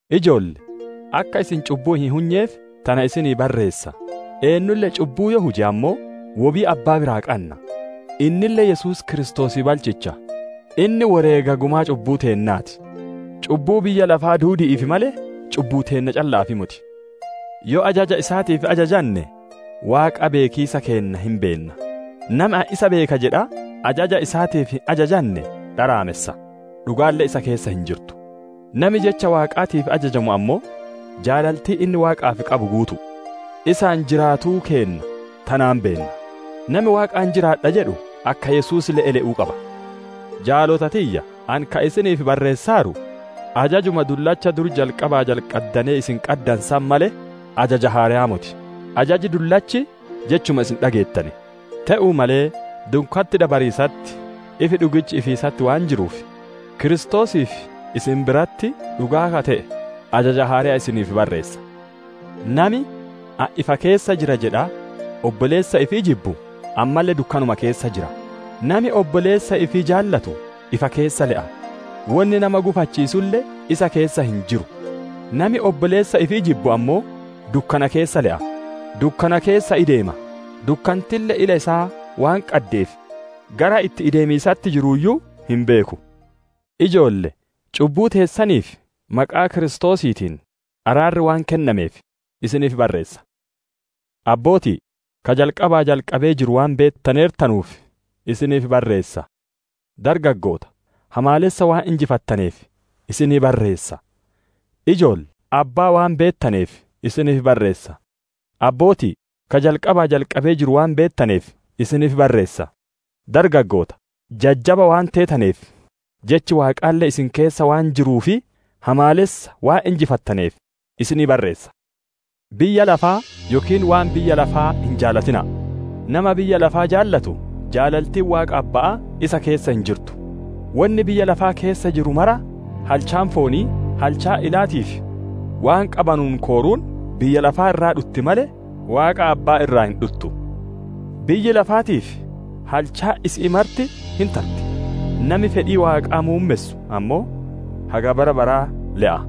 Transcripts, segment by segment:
Ijoollee, akka isin cubbuu hin hunyeef tana isiniif barreessa; eennulle cubbuu yoo huje ammoo, wobii Abbaa biraa qanna; innille Yesuus Kiristoosii balchicha. Inni woreega gumaa cubbuu teennaa ti; cubbuu biyya lafaa duudi'iif malee, cubbuu teenna calla'aaf moti. Yoo ajaja isaatiif ajajanne, Waaqa beekiisa keenna hin beenna. Nami, «Ani isa beeka» jedhaa, ajaja isaatiif hin ajajanne dharaamessa; dhugaalle isa keessa hin jirtu. Nami jecha Waaqaatiif ajajamu ammoo, jaalaltiin inni Waaqaaf qabu guutu'u. Isaan jiraatuu keenna tanaan beenna. Nami «Waaqaan jiraadha» jedhu, akka Yesuus le'e le'uu qaba. Jaalota tiyya! Ani ka isiniif barreessaaru, ajajuma dullacha dur jalqabaa jalqaddanee isin qaddanu san malee, ajaja haareyaa moti. Ajaji dullachi jechuma isin dhageettane. Te'uu malee, dukkanti dabariisatti, ifi dhugichi ifiisatti waan jiruuf, Kiristoosii fi isin biratti dhugaa ka te'e, ajaja haareya isiniif barreessa. Nami, «Ani ifa keessa jira» jedhaa obboleessa ifii jibbu, ammalle dukkanuma keessa jira. Nami obboleessa ifii jaalatu ifa keessa le'a; wonni nama gufachiisulle isa keessa hin jiru. Nami obboleessa ifii jibbu ammoo dukkana keessa le'a, dukkana keessa ideema, dukkantille ila isaa waan qaddeef gara itti ideemiisatti jiruuyyu hin beeku. Ijoolle! Cubbuu teessaniif maqaa Kiristoosiitiin araarri waan kennameef isiniif barreessa. Abbooti'i! Ka jalqabaa jalqabee jiru waan beettaneertanuuf isiniif barreessa. Dargaggoota! Hamaalessa waan injifattaneef isiniif barreessa. Ijoolle! Abbaa waan beettaneef isiniif barreessa. Abbooti'i! Ka jalqabaa jalqabee jiru waan beettaneef isiniif barreessa. Dargaggoota! Jajjaba waan teetaneef, jechi Waaqaalle isin keessa waan jiruu fi hamaalessa waan injifattaneef isiniif barreessa. Biyya lafaa yookiin waan biyya lafaa hin jaalatina'a; nama biyya lafaa jaalatu, jaalaltiin Waaqa Abba'aa isa keessa hin jirtu. Wonni biyya lafaa keessa jiru maraa: halchaan foonii, halchaan ilaatii fi waan qabanuun kooruun, biyya lafaa irraa dhutti malee, Waaqa Abbaa irraa hin dhuttu. Biyyi lafaatii fi halchaan isi'ii marti hin tarti; nami fedhii Waaqaa muummessu ammoo haga bara baraa le'a.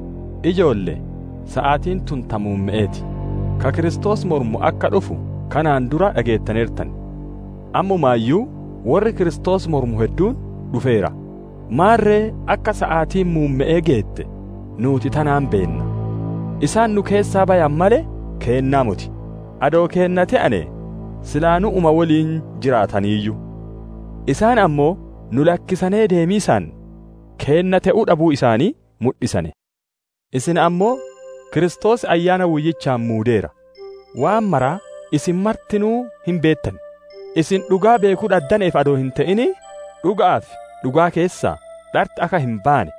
Ijoolle! Saatiin tun ta muumme'ee ti. Ka Kiristoos mormu akka dhufu kanaan duraa dhageettaneertan; ammumaayyuu worri Kiristoos mormu hedduun dhufeera. Maarre akka saatiin muumme'ee geette nuuti tanaan beenna. Isaan nu keessaa bayane malee, keennaa moti; adoo keenna te'anee sila nu'uma woliin jiraataniiyyu. Isaan ammoo nu lakkisanee deemiisaan keenna te'uu dhabuu isaanii mudhisane. Isin ammoo Kiristoos Ayyaana Woyyichaan muudeera; waan maraa isin martinuu hin beettan. Isin dhugaa beekuu dhaddaneef adoo hin te'in, dhuga'aa fi dhugaa keessaa dharti akka hin baane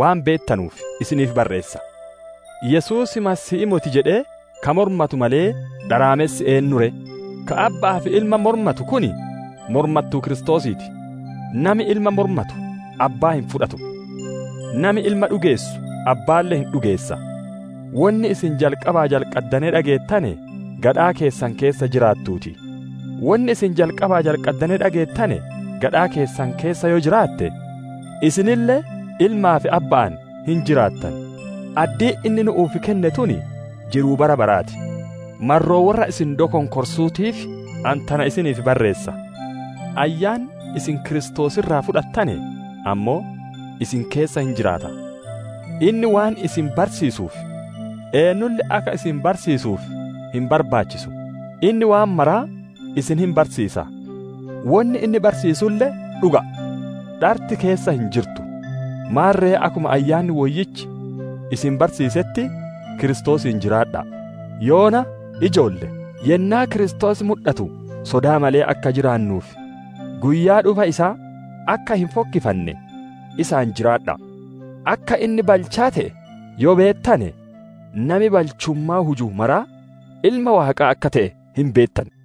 waan beettanuuf isiniif barreessa. Yesuus Masiihii moti jedhee ka mormatu malee, dharaamessi eennu ree? Ka Abba'aa fi Ilma mormatu kun mormattuu Kiristoosii ti. Nami Ilma mormatu Abbaa hin fudhatu; nami Ilma dhugeessu Abbaalle hin dhugeessa. Wonni isin jalqabaa jalqaddanee dhageettane gadhaa keessan keessa jiraattuu ti! Wonni isin jalqabaa jalqaddanee dhageettane gadhaa keessan keessa yoo jiraatte, isinille Ilmaa fi Abba'aan hin jiraattan. Addiin inni nu'uuf kenne tun jiruu bara baraa ti. Marroo worra isin dokonkorsuutiif, ani tana isiniif barreessa. Ayyaanni isin Kiristoos irraa fudhattane ammoo isin keessa hin jiraata; inni waan isin barsiisuuf, eennulle akka isin barsiisuuf hin barbaachisu. Inni waan mara isin hin barsiisa; wonni inni barsiisulle dhuga'a, dharti keessa hin jirtu. Maarre akkuma Ayyaanni Woyyichi isin barsiisetti Kiristoosiin jiraadha'a! Yoona, ijoolle! Yennaa Kiristoos mudhatu sodaa malee akka jiraannuu fi guyyaa dhufa isaa akka hin fokkifanne isaan jiraadha'a! Akka inni balchaa te'e yoo beettane, nami balchummaa huju maraa ilma Waaqaa akka te'e hin beettan.